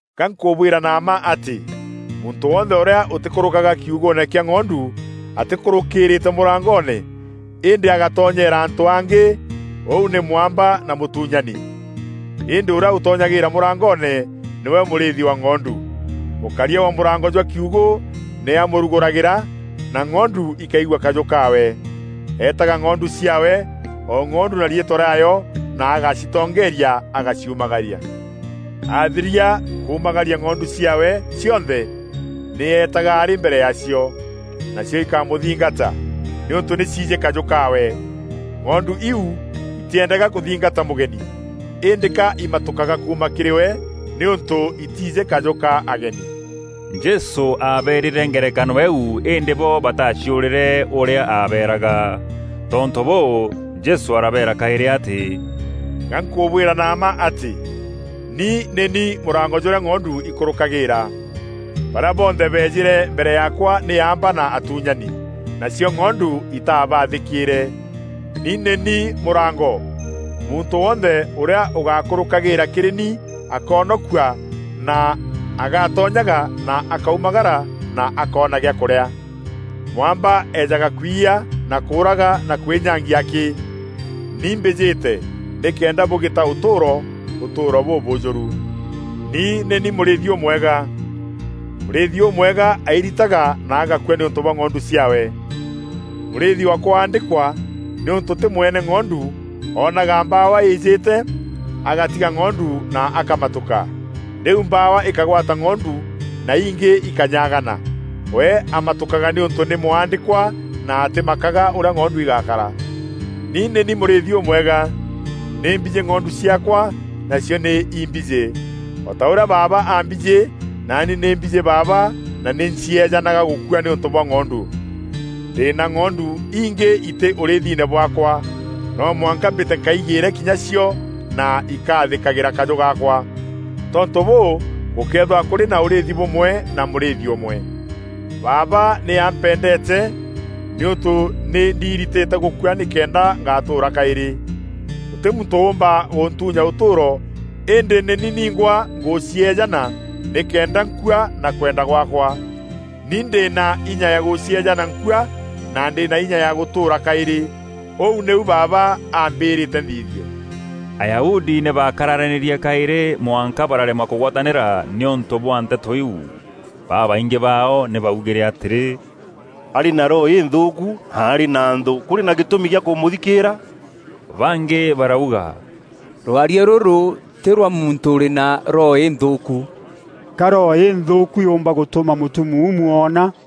“Ga nkûbwîra na mma atî, muntû wonthe ûrîa ûtîkûrûkaga kiugûûne kîa ng'ondu atîkûrûkîrîîte mûrangoone, îndî agatonyeera antû angî, ûu nî mwamba na mûtuunyani. Îndî ûrîa ûtonyagîîra mûrangoone, nîwe mûrîîthi wa ng'ondu. Mûkaria wa mûrango jwa kiugû nî aamûrugûragîra, na ng'ondu ikaigua kajû kaawe. Eetaga ng'ondu ciaawe, o ng'ondu na riîtwa rîaayo na agacitongeeria agaciumagaria. Aathiria kuumagaria ng'ondu ciaawe cionthe, nî eetaga arî mbere yaacio, nacio ikamûthingata, nîûntû nî ciijî kajû kaawe. Ng'ondu iu itîendaga kûthingata mûgeni, îndî ka imatûkaga kuuma kîrî we nîûntû itiijî kajû ka ageni.” Jesû aabeerîre ngerekano îîu îndî bo bataaciûrîre ûrîa aabeeraga. Tontû bûû, Jesû arabeera kaîrî atî, “Ga nkûbwîra na mma atî, ni nî ni mûrango jûrîa ng'ondu ikûrûkagîîra. Barîa bonthe beejîre mbere yaakwa nî aamba na atuunyani, nacio ng'ondu itaabathîkîîre. Ni nî ni Mûrango. Muntû wonthe ûrîa ûgakûrûkagîîra kîrî ni akoonokua na agatonyaga na akaumagara na akoona gîa kûrîa. Mwamba eejaga kwiya na kûûraga na kwînyangia akî. Ni mbîjîte nîkenda bûgîta ûtûûro, ûtûûro bûbûjûru. “Ni nî ni mûrîîthi ûmwega. Mûrîîthi ûmwega airitaga na agakua nîûntû bwa ng'ondu ciaawe. Mûrîîthi wa kwaandîkwa, nîûntû tî mwene ng'ondu, oonaga mbawa îîjîte agatiga ng'ondu na akamatûka. Rîu mbawa îkagwata ng'ondu na ingî ikanyagana. We amatûkaga nîûntû nî mwandîkwa na atîmakaga ûrîa ng'ondu igakara. Ni nî ni mûrîîthi ûmwega. Nî mbijî ng'ondu ciaakwa, nacio nî imbijî. O ta ûrîa Baaba ambijî naani nî mbijî Baaba na nî ncieejanaga gûkua nîûntû bwa ng'ondu. Ndî na ng'ondu ingî itî ûrîîthine bwaakwa. No mwanka mbîte nkaigîîre kinya cio na ikaathîkagîra kajû gaakwa. Tontû bûû, gûkeethîrwa kûrî na ûrîîthi bûmwe na mûrîîthi ûmwe. “Baaba nî ampendeete nîûntû nî ndiiritîte gûkua nîkenda ngatûûra kaîrî. Gûtî muntû ûûmba gûntuunya ûtûûro îndî nî ni ningwa ngûcieejana nîkenda nkua na kwenda gwaakwa. Ni ndî na inya ya gûcieejana nkua na ndî na inya ya gûtûûra kaîrî. Ûu nîu Baaba ambîrîte nthithie.” Ayahudi nî baakararanîrie kaîrî mwanka bararemwa kûgwatanîra nîûntû bwa nteto iu. Babaingî baao nî baugîre atîrî, “Arî na roho înthûûku na arî na nthû. Kûrî na gîtûmi kîa kûmûthikîîra?” Bangî barauga, “Rwaria rûrû tî rwa muntû ûrî na roho înthûûku. Ka roho înthûûku yûûmba gûtûma mûtumuumu oona?”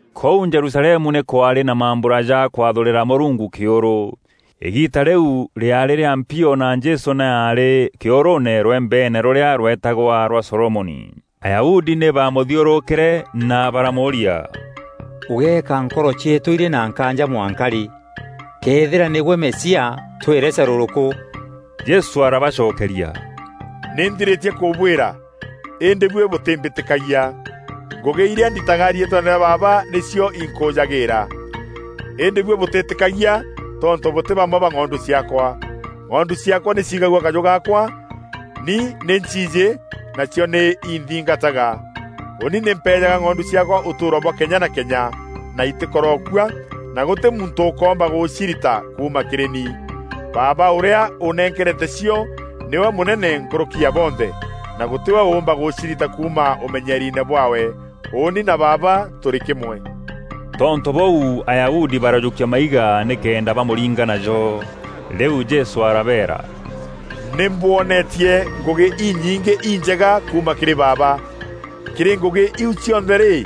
Kûu Jerusalemu nî kwaarî na mambura ja kwathûrîra Mûrungu kîûrû. Îgiita rîu rîaarî rîa mpio na Jesû nî aarî kîûrûûne rwembeene rûrîa rwetagwa rwa Solomoni. Ayahudi nî baamûthiûrûkîre na baramûûria, “Ûgeeka nkoro cieetû irî na nkaanja mwanka rî? Këethîra nîgwe Mesia, twîre carûrûkû.” Jesû arabacokeria, “Nî nthirîtie kûbwîra, îndî buî bûtîmbîtîkagia. Ngûgî irîa ndîtaga riîtweene rîa Baaba nîcio inkûûjagîîra. Îndî buî bûtîîtîkagia tontû bûtî bamwe ba ng'ondu ciaakwa. Ng'ondu ciaakwa nî ciigagua kajû gaakwa; ni nî nciijî, nacio nî inthingataga. Ûûni nî mpeejaga ng'ondu ciaakwa ûtûûro bwa kenya na kenya; na itîkorokua, na gûtî muntû ûkoomba gûcirita kuuma kîrî ni. Baaba ûrîa ûnenkerete cio nîwe mûnene nkûrûki ya bonthe, na gûtî we ûûmba gûcirita kuuma ûmenyeriine bwaawe. Ûûni na Baaba tûrî kîmwe.” Tontû bûu Ayahudi barajûkia maiga nîkenda bamûringa najo. Rîu Jesû arabeera, “Nî mbwonetie ngûgî inyingî injega kuuma kîrî Baaba. Kîrî ngûgî iu cionthe rî,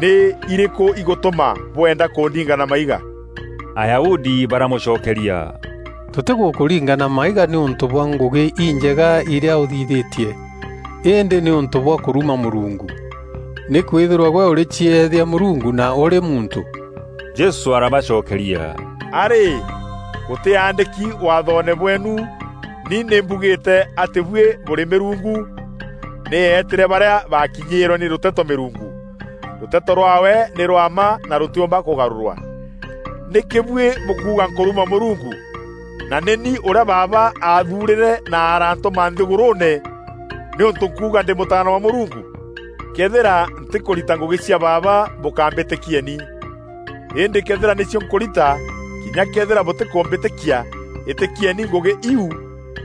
nî irîkû igûtûma bwenda kûndinga na maiga?” Ayahudi baramûcokeria, “Tûtîgûkûringa na maiga nîûntû bwa ngûgî injega irîa ûthithîtie, îndî nîûntû bwa kûruma Mûrungu. Nîkwîthîrwa gwe ûrîcieethia Mûrungu na ûrî muntû.” Jesû arabacokeria, “A rî, gûtîandîki waathoone bweenu: ‘Ni nî mbugîîte atî buî bûrî mîrungu?’ Mûrungu nî eetîre barîa baakinyîîrwe nî rûteto mîrungu. Rûteto rwaawe nî rwa mma na rûtîûmba kûgarûrwa. Nîkî buî bûkuuga nkûruma Mûrungu na nî ni ûrîa Baaba aathuurîre na aarantûma nthîgûrûûne nîûntû nkuuga ‘Ndî Mûtaana wa Mûrungu?’ Këethîra ntîkûrita ngûgî cia Baaba, bûkambîtîkieni. Îndî këethîra nîcio nkûrita, kinya këethîra bûtîkûmbîtîkia, îtîkieni ngûgî iu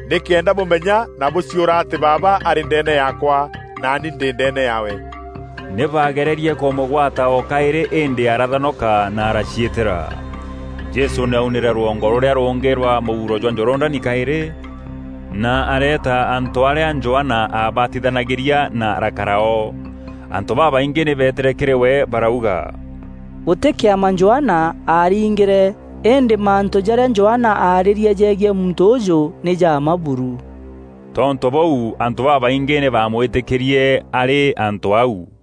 nîkenda bûmenya na bûciûra atî Baaba arî ndeene yaakwa, naani ndî ndeene yaawe.” Nî baagererie kûmûgwata o kaîrî îndî arathonoka na araaciîtîra. Jesû nî aaunîre rwongo rûrîa rûngî rwa mûuro jwa Jorodani kaîrî, na areeta antû arîa Johana aabatithanagîria na arakara o. Antû babaingî nî beetîre kîrî we barauga, “Gûtî kîama Johana aarîngîre îndî mantû jarîa Johana aarîrie jegiî muntû ûûjû nî ja mma buru.” Tontû bûu antû babaingî nî baamwîtîkîrie arî antû au.